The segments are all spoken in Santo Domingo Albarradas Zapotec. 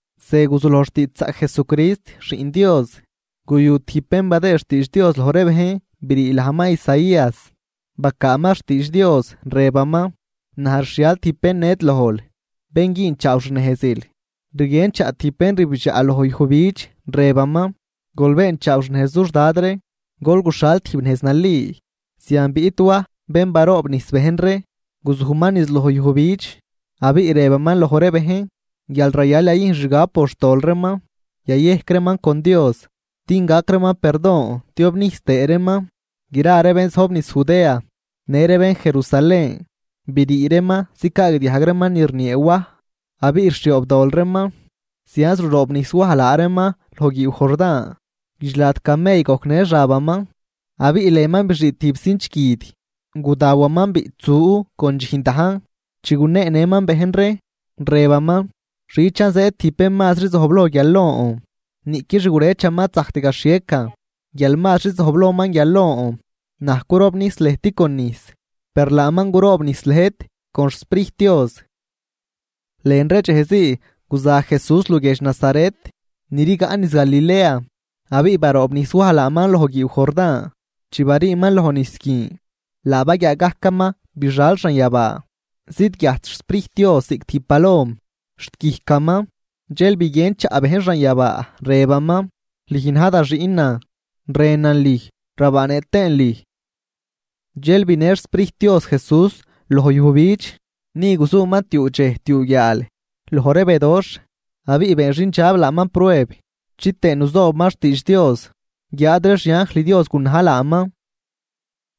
Ze guzuloj xtiidxzaꞌc Jesucrist, Xiꞌn Dios. Guyu tijb bén badëë xtiidx Dios loj ree bejn brii lajman Isaías, bacaaman xtiidx Dios, rëbaman: Naj rxhial tijb bén ned lojl, bén güünchaaw xnejzil. Rguien chaꞌ tijb bén rbidxaꞌ loj yujbidx, rëbaman: “Gol beenchaaw xnejz dux Dad ree, gol guxhal tijb nejz nali.” Zian biꞌt Waj bén baroobnijs bejn ree, guzujman niz loj yujbidx, abiꞌ rëbaman loj ree bejn guial rayal yayüjn xgab por xtol reeman, yayejc reeman con Dios din gac reeman perdon tiobnijs tëë reeman. Gra ree bén zojb niz Judea, në ree bén Jerusalén brii reeman zicaagdiajg reeman ni rniee Waj, abiꞌ rxhioobdol reeman. Zianz ruroobnijs Waj laa reeman loj guiiw Jordán. Guidxlad camell gojcnë xabaman, abiꞌ lënman bixii tijb cinch guid. Gudawaman biꞌtsu con dxijn dajn. Chi guneenëman bejn ree, rëbaman: ―Xichan zëëd tijb bén mazri zojbloj guial lon, niꞌqui xgurëchaman ad zajct gaxhiecan guial mazri zojblojman guial lon. Naj curobnijs lëjt con nijs, per laaman guroobnijs lëjt con xSprijt Dios. Lën ree dxejzii guza Jesús luguiedx Nazaret ni rigaꞌ niz Galilea, abiꞌ baroobnijs Waj laaman loj guiiw Jordán. Chi bariiman loj nijs guin, laa baguiaa gajcaman bixal xanyabaa, zidguiajt xSprijt Dios ziꞌc tijb palom xt guijcaman. Dxel biguien chaꞌ bejn xanyabaa, rëbaman: ―Lüj na̱j da Xiꞌnan, rënan lüj rabaanëꞌ tëën lüj. Dxel binë xSprijt Dios Jesús loj yujbidx. Ni guzuman tiuu dxej tiuu guiaal, loj ree bedoxh. Abiꞌ been xindxab laaman prueb chitëë nuzoobaman xtiidx Dios, guiáad ree xianjl Dios gunaj laaman.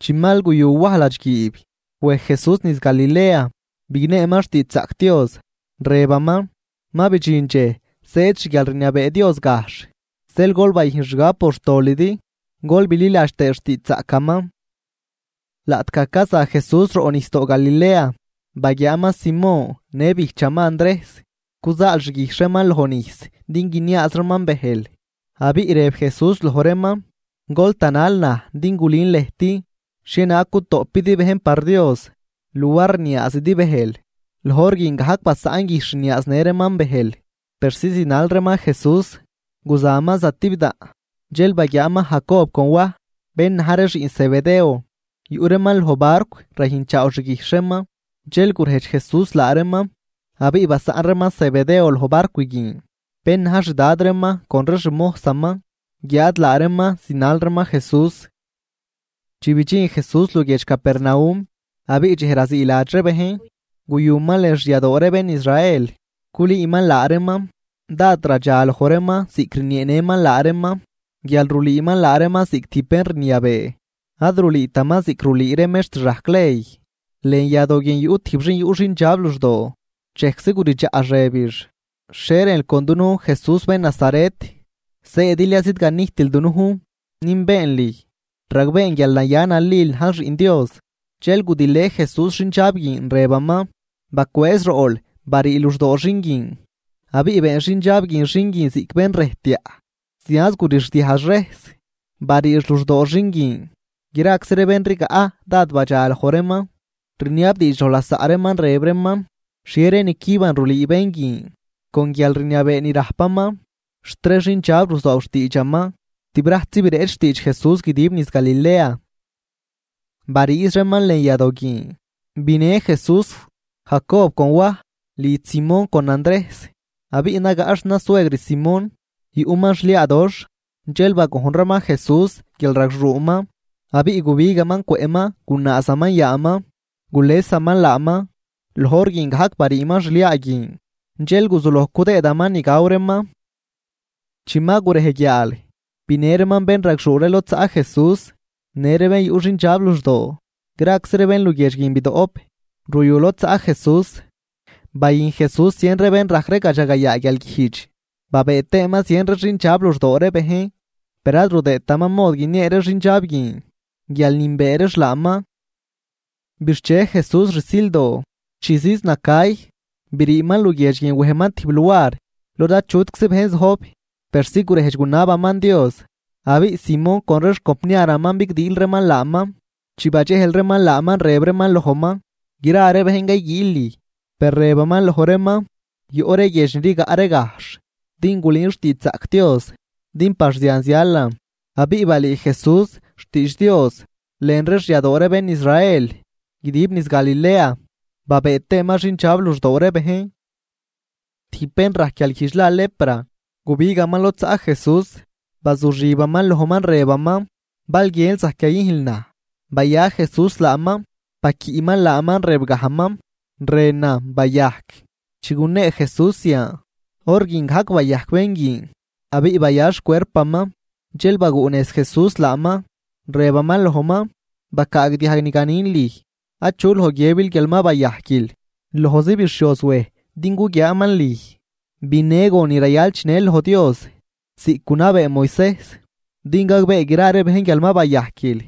Chi mal guyu Waj ladxguiib, wej Jesús niz Galilea bigneeman xtiidxzaꞌc Dios, rëbaman: ―Ma bidxin dxej zëëd xguialrniabee Dios gajxh, zeel gol bayüjn xgab por xtolidi, gol bililadx tëë xtiidxzaꞌcaman. Laꞌtgaj caza Jesús roꞌnijsdoo Galilea, baguiaaman Simón në bijchaman Andrejs, cuzaal xguijxh reeman lojnijs din guiniaaz reeman bëjl. Abiꞌ rëb Jesús loj reeman: ―Gol tanal naj din gulün lëjt xhienaag gutoꞌpidi bejn par Dios, luar rniaazidi bëjl. Loj hor guin gajc basaꞌn guijxh rniaaznë reeman bëjl persi zinal reeman Jesús. Guzaman zatibdaꞌn, dxel baguiaaman Jacob con Waj bén na̱j ree xiꞌn Zebedeo, yuꞌ reeman loj barcw rayüjnchaaw xguijxh reeman. Dxel gurejdx Jesús laa reeman, abiꞌ basaꞌn reeman Zebedeo loj barcw guin, bén na̱j xdad reeman con ree xmojsaman, guiáad laa reeman zinal reeman Jesús. Chi bidxin Jesús luguiedx Capernaum. Abiꞌ dxej raziiladx ree bejn guyuman lën xyadoo ree bén Israel culüüman laa reeman. Dád radxa loj reeman ziꞌc rnieenëman laa reeman guial rulüüman laa reeman ziꞌc tijb bén rniabee, ad rulüütaman ziꞌc rulüü ree mextr rajc ley. Lën yadoo guin yuꞌ tijb xin yuꞌ xindxab luxdoo, dxejczi guridxaꞌx rëbix: ―¿Xhie rënl con dunujn, Jesús bén Nazaret? ¿Zëëdil ya zidganijtil dunujn? Nünbeen lüj, ragbeen guial naya nalil najl xiꞌn Dios. Dxel gudilë Jesús xindxab guin, rëbaman: ―¡Bacwëëz roꞌl, barii luxdoo xin guin! Abiꞌ been xindxab guin xin guin ziꞌc bén rëjtyaꞌ, zianz gurixdiajx rejs, bariix luxdoo xin guin. Graczi ree bén rigaꞌ dád badxaloj reeman, riniabdiidx loj lasaꞌ reeman rëb reeman: ―¿Xhie ree nicüban rulüü bén guin? ¡Con guialrniabee ni rajpaman xt ree xindxab ruzoob xtiidxaman! Tibrajtzi bireꞌch xtiidx Jesús guidib niz Galilea. Bariiz reeman lën yadoo guin, binë Jesús Jacob con Waj lidx Simón con Andrejs. Abiꞌ nagaꞌ xnasuegr Simón, yuꞌman xliaadoxh. Dxel bagojn reeman Jesús guial ragxuuman. Abiꞌ gubigaman cwëꞌman gunaazaman yaaman, gulesaman laaman. Loj hor guin gajc bariiman xliaa guin dxel guzuloj cudëëdaman ni gaw reeman. Chi ma gurej guiaal, binë reeman bénragxuu ree lod zaꞌ Jesús, në ree bén yuꞌ xindxab luxdoo. Graczi ree bén luguiedx guin bidoꞌp ruyu lod zaꞌ Jesús. Bayüjn Jesús zien ree bén rajc ree gadxagayaa guialguijdx, babëë tëëman zien ree xindxab luxdoo ree bejn. Per ad rudëëtaman mod guiniee ree xindxab guin guial nünbee reex laaman. Bixche Jesús rsildoo, chi ziiz nacay, briiman luguiedx guin wejman tijb luar lod achutczi bejn zojb, persi gurejdx gunabaman Dios. Abiꞌ Simón con ree xcompniaraman bigdiil reeman laaman. Chi badxejl reeman laaman, rëb reeman lojman: ―Gra ree bejn cayguiil lüj. Per rëbaman loj reeman: ―Yoꞌ ree guiedx ni rigaꞌ ree gajxh din gulün xtiidxzaꞌc Dios, din par zian zialan. Abiꞌ balüü Jesús xtiidx Dios lën ree xyadoo ree bén Israel guidib niz Galilea babëë tëëman xindxab luxdoo ree bejn. Tijb bén rajc guialguijdx la lepra, gubigaman lod zaꞌ Jesús, bazuxibaman lojman rëbaman ―Bal guiënl, zajc yayüjnl naj. Baya Jesús laaman, baquiꞌman laaman, rëbgajman: ―Rënan, bayajc. Chi gunee Jesús zian, hor guin gajc bayajc bén guin abiꞌ baya xcuerpaman. Dxel baguꞌnejz Jesús laaman, rëbaman lojman: ―Bacaagdiajg ni ganin lüj. Achu loj guiëbil guial ma bayajquil. Lojzi bixhioz wej din guguiaaman lüj, binë gon ni rayal chinël loj Dios ziꞌc gunabee Moisejs, din gagbee gra ree bejn guial ma bayajquil.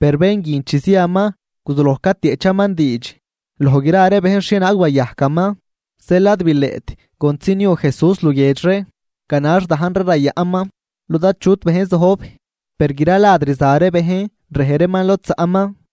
Per bén guin chi ziaman guzuloj catieꞌchaman diidx loj gra bejn xhienaag bayajcaman. Zeel ad bileꞌt contzi niu Jesús luguiedx ree, ganax dajn ree rayaꞌnman lod achut bejn zojb. Per gra lad rza ree bejn rej reeman lod zaꞌman.